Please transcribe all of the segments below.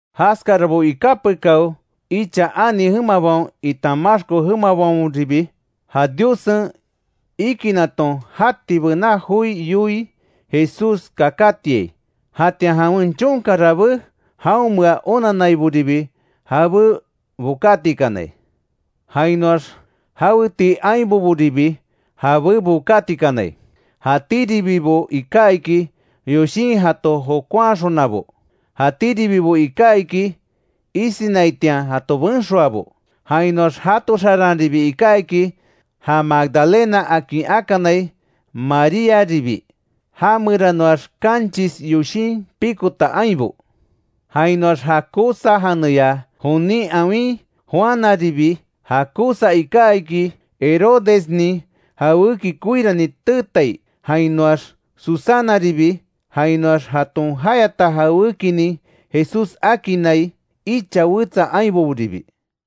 Jaskarabo iká pekáo, icha ani jemabaon itan maxko jemabaonribi, ja Diossen ikinaton jati bená joi yoii Jesús kakátiai; jatian jawen chonka rabé jaonmea onanaiboribi jabé bokátikanai. Jainoax jaweti ainboboribi jabé bokátikanai; jatíribibo iká iki, yoshin jato jokonhaxonabo; jatíribibo iká iki isinaitian jato benxoabo. Jainoax jato xaranribi iká iki, ja Magdalena akin akanai Maríaribi, já meranoax kanchis yoshin pikota ainbo. Jainoax ja Cuza janeya jonin awin Juanaribi; ja Cuza iká iki, Herodesnin jawéki koirani teetai, jainoax Susanaribi. Jainoax jaton jayata jawékinin Jesús akinnai icha wetsa ainboboribi.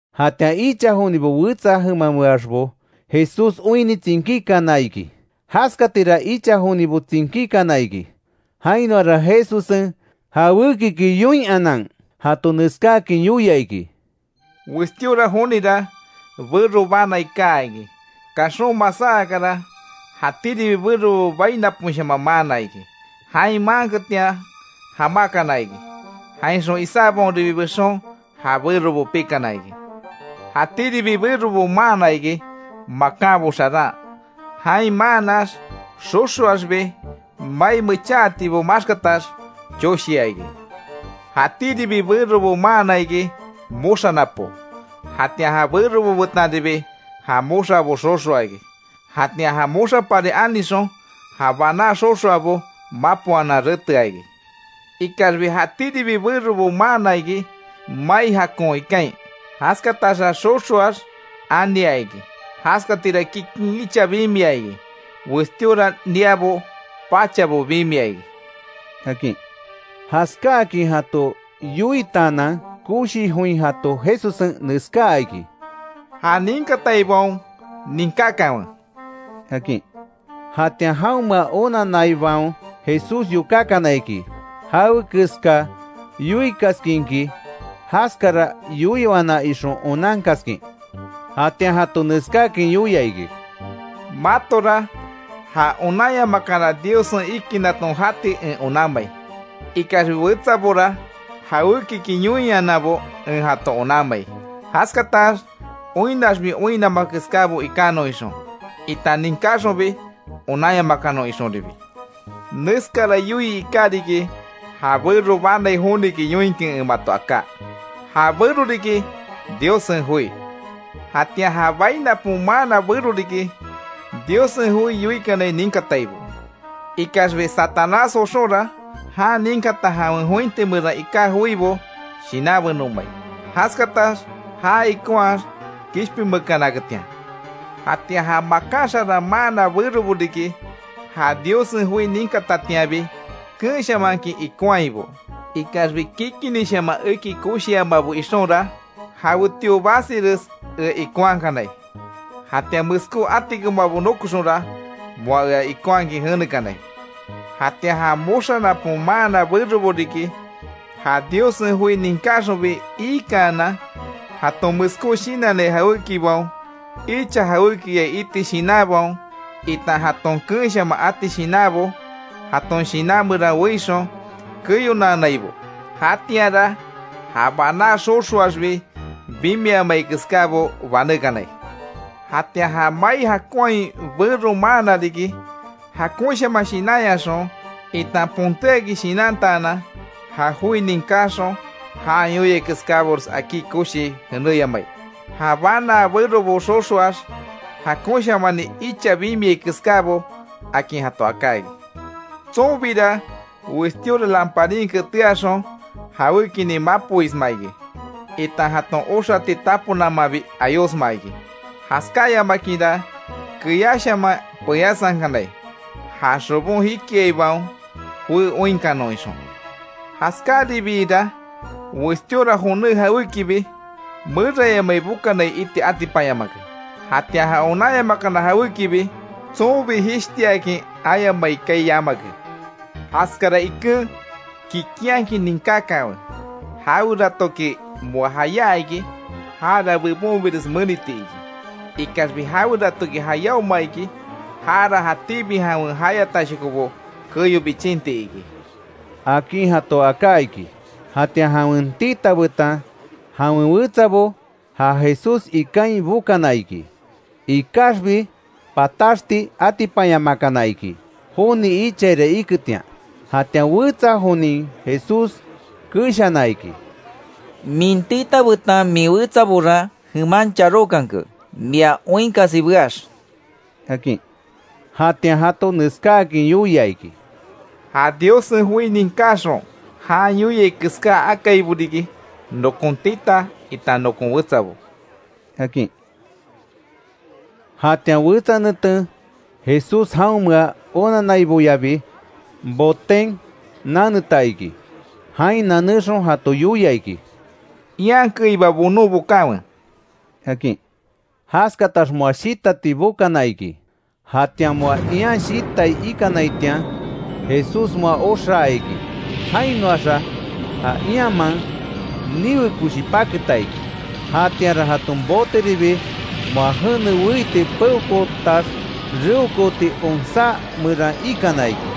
Jatian icha jonibo wetsa jemameaxbo Jesús oinni tsinkíkana iki. Jaskatira icha jonibo tsinkíkana iki; jainoara Jesussen, jawékiki yoinhanan jato neskáakin yoia iki: “Westíora jonira, bero banai kaa iki; kaxon masá akara, jatíribi berobo bai naposhaman maana iki; jain maanketian, jamákana iki; jainxon isábaonribi bexon, ja berobo pikana iki. Jatíribi berobo maana iki, makánbo xaran. Jain maannax xoxoaxbi mai mecháatibo maxkatax choshia iki. Jatíribi berobo maana iki; moxa napo, jatian ja berobo betanribi ja moxabo xoxoa iki; jatian ja moxapari anixon, ja baná xoxoabo, mapoanan retea iki. Ikaxbi jatíribi berobo maana iki, mai jakon ikain; jaskataxa xoxoax ania iki. Jaskatira kikin icha bimia iki; westíora niábo pachabo bimia iki”, akin. Jaskáakin jato yoitaanan, koshi join jato Jesussen neskáa iki: “¡Ja ninkataibaon ninkákanwe!” akin. Jatian jaonmea onanaibaon Jesús yokákana iki; jawekeska yoikaskinki jaskara yoiwana ixon onankaskin. Jatian jato neskáakin yoia iki: “Matora ja onanyamakana Diossen ikinaton jati en onanmai; ikaxbi wetsabora jawékiki yoinhananbo en jato onanmai; jaskatax oinnaxbi oinnama keskábo ikanon ixon, itan ninkáxonbi onanyamakanon ixonribi. Neskara yoii iká riki, ja bero banai joniki yoinkin en mato aká: Ja bero riki Diossen joi. Jatian ja bai napon maana bero riki, Diossen joi yoikanai ninkataibo. Ikaxbi Satanás joxonra jan ninkata jawen jointi meran iká joibo shinanbenomai; jaskatax já ikonhaax kishpinmeekanaketian. Jatian ja makan xaran maana berobo riki, ja Diossen joi ninkatatianbi, keenshamankin ikonhaibo. Ikaxbi kikinishaman eki koshiamabo ixonra, jawetio basires ea ikonhakanai. Jatian meskó atikomabo nokoxonra, moa ea ikonhakin jenekanai. Jatian ja moxa napon maana berobo riki, ja Diossen joi ninkáxonbi, iikaanan, jaton meskó shinannai jawékibaon, icha jawékiya iti shinanbaon, itan jaton keenshaman ati shinanbo, jaton shinan meran weixon keyonaanaibo; jatianra ja baná xoxoaxbi bimiamai keskábo banékanai. Jatian ja mai jakonhain bero maana riki; jakonshaman shinanyaxon, itan pontéakin shinantaanan, ja joi ninkáxon jan yoiai keskábores akí koshii jenéyamai; ja banaa berobo xoxoax, jakonshamani icha bimiai keskábo, akin jato aká iki. Tsonbira westíora lamparin ketéaxon, jawékinin mapoisma iki, itan jaton oxati tapo namanbi ayosma iki. Jaskáyamakinra keyáshaman peyásankanai, ja xobon jikiaibaon joé oinkanon ixon. Jaskáribiira westíora joné jawékibi, merayamai bokanai iti atipanyamake; jatian ja onanyamakana jawékibi, tsonbi jishtiakin ayamai kaai yamake. Jaskara iken kikinhakin ninkákanwe, jaweratoki moa jayá iki, jara bebonbires meniti iki. Ikaxbi jaweratoki jayáoma iki, jara jatíbi jawen jayatashokobo keyo bichinti iki”, akin jato aká iki. Jatian jawen tita betan jawen wetsabo, ja Jesús ikain bokana iki. Ikaxbi pataxti atipanyamakana iki joni ichaira iketian. Jatian wetsa jonin Jesús keshana iki: —Min tita betan min wetsabora jeman charókanke, mia oinkasi beax —akin. Jatian jato neskáakin yoia iki: —Ja Diossen joi ninkáxon jan yoiai keská akaibo riki, nokon tita itan nokon wetsabo —akin. Jatian wetsa neten, Jesús jaonmea onanaiboyabi, boten naneta iki, jain nanexon jato yoia iki: —Ian keiba bonon bokanwe —akin. Jaskatax moa shitati bokana iki, jatian moa ian shitai ikanaitian, Jesús moa oxaa iki; jainoaxa ja ianman niwe koshi paketa iki; jatianra jaton boteribi moa jene weiti peokootax reokooti onsá meran ikana iki.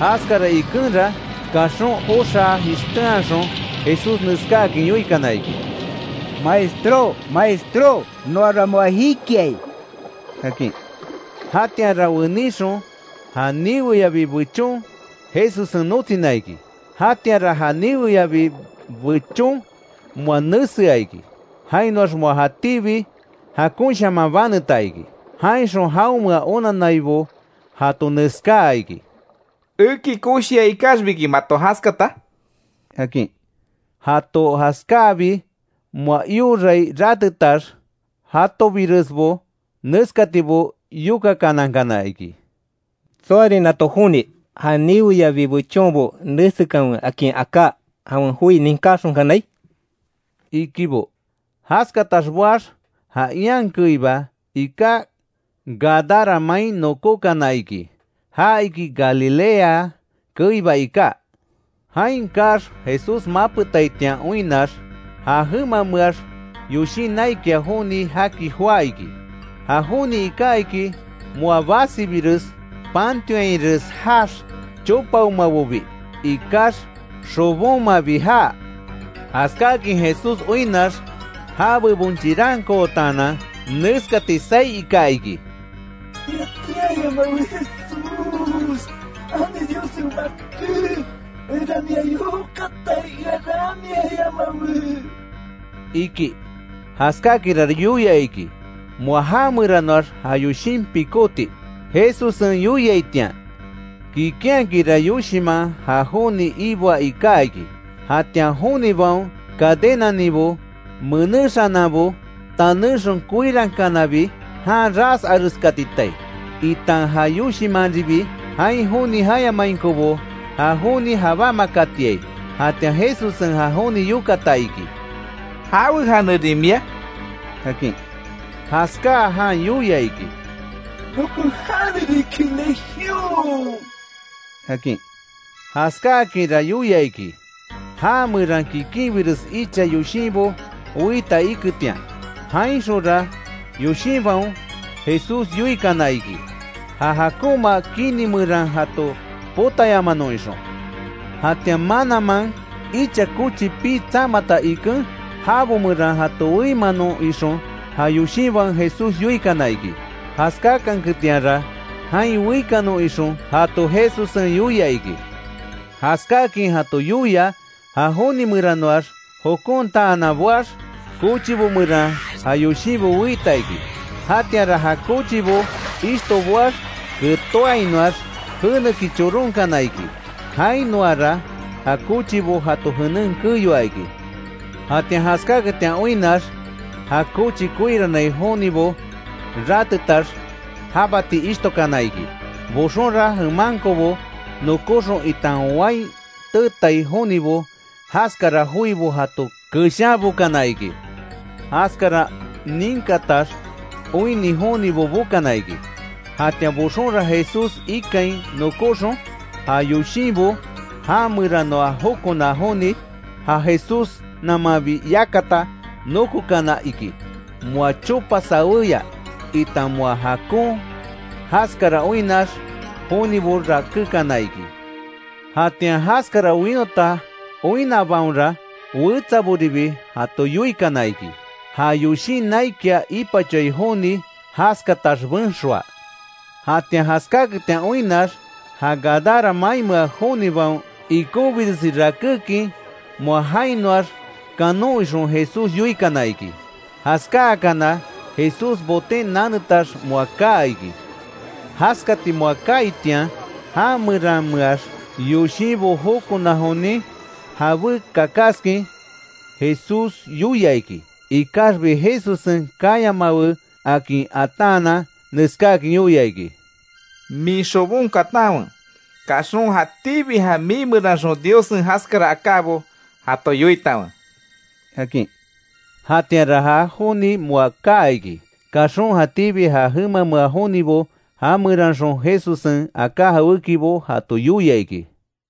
Jaskara ikenra, kaxon oxá jishténhaxon Jesús neskáakin yoikana iki: —¡Maestró!, ¡Maestró! ¡Noara moa jikiai! —akin. Jatianra weníxon, ja niweyabi bechon Jesussen notsina iki. Jatianra ja niweyabi, bechon moa nesea iki, jainoax moa jatíbi jakonshaman baneta iki. Jainxon jaonmea onannaibo jato neskáa iki: —¿Eki koshia ikaxbiki mato jaskata? —akin. Jato jaskáabi moa iorai ratetax, jatobiresbo neskatibo yokakanankana iki: —¿Tsoarin nato joni; ja niweyabi bechonbo nesekanwe akin aká, jawen joi ninkáxonkanai? —ikibo. Jaskatax boax, ja ian keiba iká Gadara main nokókana iki; ja iki Galilea keiba iká. Jain kaax Jesús mapetaitian oinnax, ja jemameax yoshin naikia joni jaki joá iki; ja joni iká iki, moa basibires pantionhainres jaax, chopaomabobi ikax, xobonmabi jaa. Jaskáakin Jesús oinnax ja bebon chirankootaanan, neskati saí ika iki: —¡Ea teayamawe Jesús, ani Diossen Baké! ¡Enra mia yokatai, ea ramiayamawe! —iki. Jaskáakinra yoia iki; moa já meranoax ja yoshin pikóti Jesussen yoiaitian. Kikinhakinra yoshinman ja joni iboa iká iki. Jatian jonibaon cadenaninbo menéxananbo, tanéxon koirankanabi, jan ras areskatitai, itan ja yoshinmanribi, jain joni jayamainkobo ja joni jabámakatiai. Jatian Jesussen ja joni yokata iki: —¿Jawe janerin mia? —akin. Jaskáa jan yoia iki: —Nokon jane riki Legión —akin. Jaskáakinra yoia iki, já meran kikinbires icha yoshinbo weita iketian. Jainxonra yoshinbaon Jesús yoikana iki, ja jakonma kini meran jato potayamanon ixon. Jatian mananman icha kochi pii tsamata iken; jabo meran jato weimanon ixon ja yoshinbaon Jesús yoikana iki. Jaskáakanketianra jain weikanon ixon jato Jesussen yoia iki. Jaskáakin jato yoia, ja joni meranoax jokontaanan boax, kochibo meran ja yoshinbo weita iki. Jatianra ja kochibo ishto boax, ketóainoax jeneki choronkana iki, jainoara ja kochibo jato jenen keyoa iki. Jatian jaskáketian oinnax, ja kochi koirannai jonibo rátetax, jabati ishtokana iki. Boxonra jemankobo nokóxon itan wain teetai jonibo, jaskara joibo jato keshanbokana iki. Jaskara ninkatax oinni jonibo bokana iki. Jatian boxonra Jesús ikain nokóxon, ja yoshinbo já meranoa jokona joni, ja Jesús namanbi yakata, nokokana iki; moa chopa sawéya itan moa jakon. Jaskara oinnax jonibo rakékana iki. Jatian jaskara winota oinnabaonra wetsaboribi, jato yoikana iki. Ja yoshin naikia ipachoai joni, jaskatax benxoa. Jatian jaskáaketian oinnax, ja Gadara mainmea jonibaon, ikonbiresi rakékin moa jainoax kanon ixon Jesús yoikana iki. Jaskáakana Jesús boten nanetax moa kaa iki. Jaskati moa kaaitian, já merameax yoshinbo jokona jonin, jabé kakaskin Jesús yoia iki; ikaxbi Jesussen kayamawe akin ataanan; neskáakin yoia iki: —Min xobon katanwe, kaxon jatíbi ja mii meranxon Diossen jaskara akábo jato yoitanwe —akin. Jatianra ja joni moa kaa iki. Kaxon jatíbi ja jemamea jonibo, ja meranxon Jesussen aká jawékibo jato yoia iki.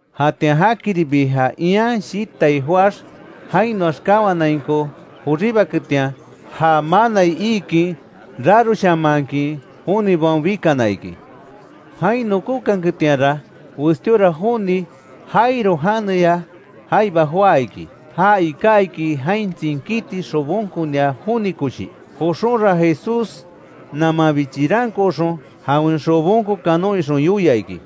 Jatian jakiribi ja ian shitai joáx, jainoax kawanainko joribaketian; ja manai iikin, raroshamankin jonibaon bikana iki. Jain nokóketianra westíora joni Jairo janeya jaiba joá iki, ja iká iki jain tsinkíti xobonkonia joni koshi; joxonra Jesús namanbi chirankooxon, jawen xobon kanon ixon yoia iki.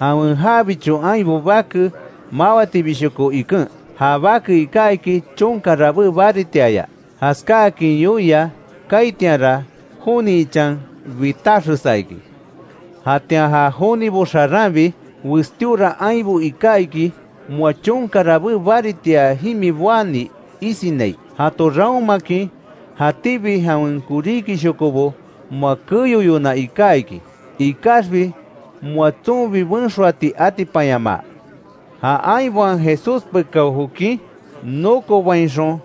Jawen jabicho ainbo bake mawatibishoko iken. Ja bake iká iki chonka rabé baritiaya. Jaskáakin yoia kaaitianra joni ichan bitaxesa iki. Jatian ja jonibo xaranribi westíora ainbo iká iki; moa chonka rabé baritia jimi boani isinai. Jato raonmakin jatíbi jawen koríkishokobo moa keyoyona iká iki; ikaxbi moa tsonbi benxoati atipanyamaa. Ja ainbaon Jesús pekao jokin nokobainxon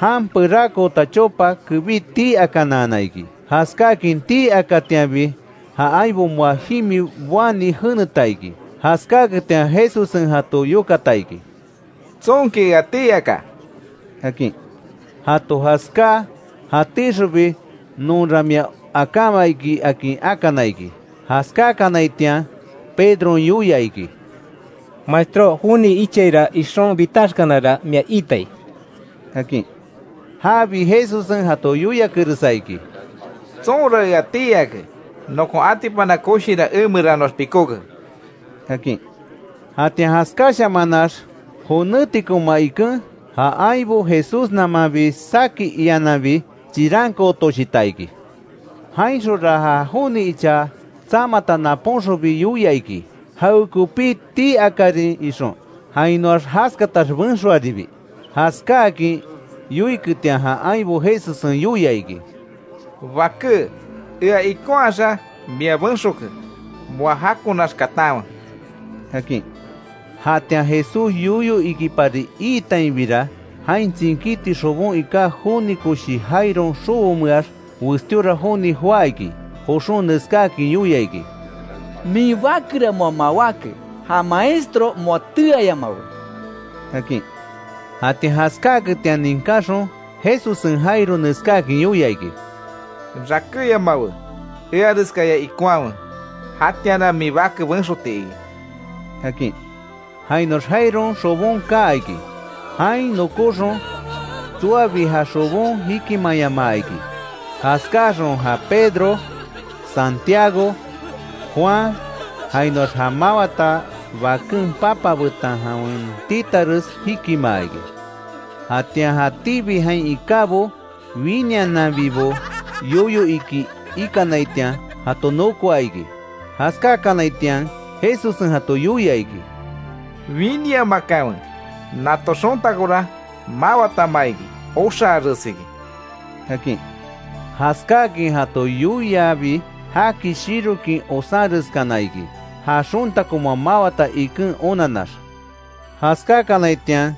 jan perakoota chopa kebí tii akanaana iki. Jaskáakin tii akatianbi ja ainbo moa jimi boani jeneta iki. Jaskáaketian Jesussen jato yokata iki: —¿Tsonki ea tii aka? —akin. Jato jaskáa jatíxonbi nonra mia akáma iki, akin akana iki. Jaskákanaitian Pedron yoia iki: —Maestró, joni ichaira ixon bitaxkanara mia iitai —akin. Jabi Jesussen jato yoiakeresa iki: —Tsonra ea tii ake, nokon atipana koshira emeranoax pikóke —akin. Jatian jaskáshamanax jonétikoma iken, ja ainbo, Jesús namanbi saki iananbi chirankootoshita iki. Jainxonra ja joni icha tsamata napónxonbi yoia iki; jawekopi tii akárin ixon, jainoax jaskatax benxoaribi. Jaskáakin yoiketian ja ainbo Jesussen yoia iki: —Baké, ea ikonhaxa mia benxoke, moa jakonax katanwe —akin. Jatian Jesús yoyo ikipari iitainbira, jain tsinkíti xobon iká joni koshi Jairon xobomeax, westíora joni joá iki, joxon neskáakin yoia iki: —Min bakera moa mawáke, ja Maestro moa teayamawe —akin. Jatian jaskáaketian ninkáxon Jesussen Jairo neskáakin yoia iki: —Rakéyamawe eareskaya ikonhawe, jatianra min bake benxoti iki —akin. Jainoax Jairon xobon kaa iki, jain nokóxon, tsoabi ja xobon jikimayamaa iki. Jaskáxon ja Pedro, Santiago, Juan jainoax ja mawata baken papa betan jawen titares jikimaa iki. Jatian jatíbi jain ikábo, winiananbibo yoyo iki ikanaitian, jato nokoa iki. Jaskákanaitian Jesussen jato yoia iki: —Winiamakanwe, nato xontakora mawatama iki; oxaaresiki —akin. Jaskáakin jato yoiabi jaki shirokin osanreskana iki, ja xontako moa mawata iken onanax. Jaskákanaitian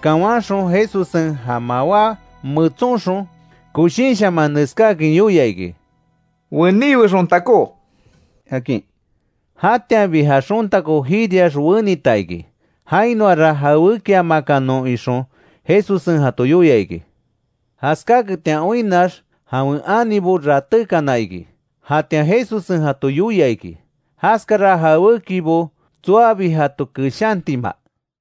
kawanxon, Jesussen ja mawá metsonxon, koshinshaman neskáakin yoia iki: —¡Weniwe xontakó! —akin. Jatianbi ja xontako jiriax wenita iki; jainoara jawékiamakanon ixon jato Jesussen yoia iki. Jaskáketian oinnax jawen anibo ratékana iki; jatian Jesussen jato yoia iki, jaskara jawékibo tsoabi jato keshantima.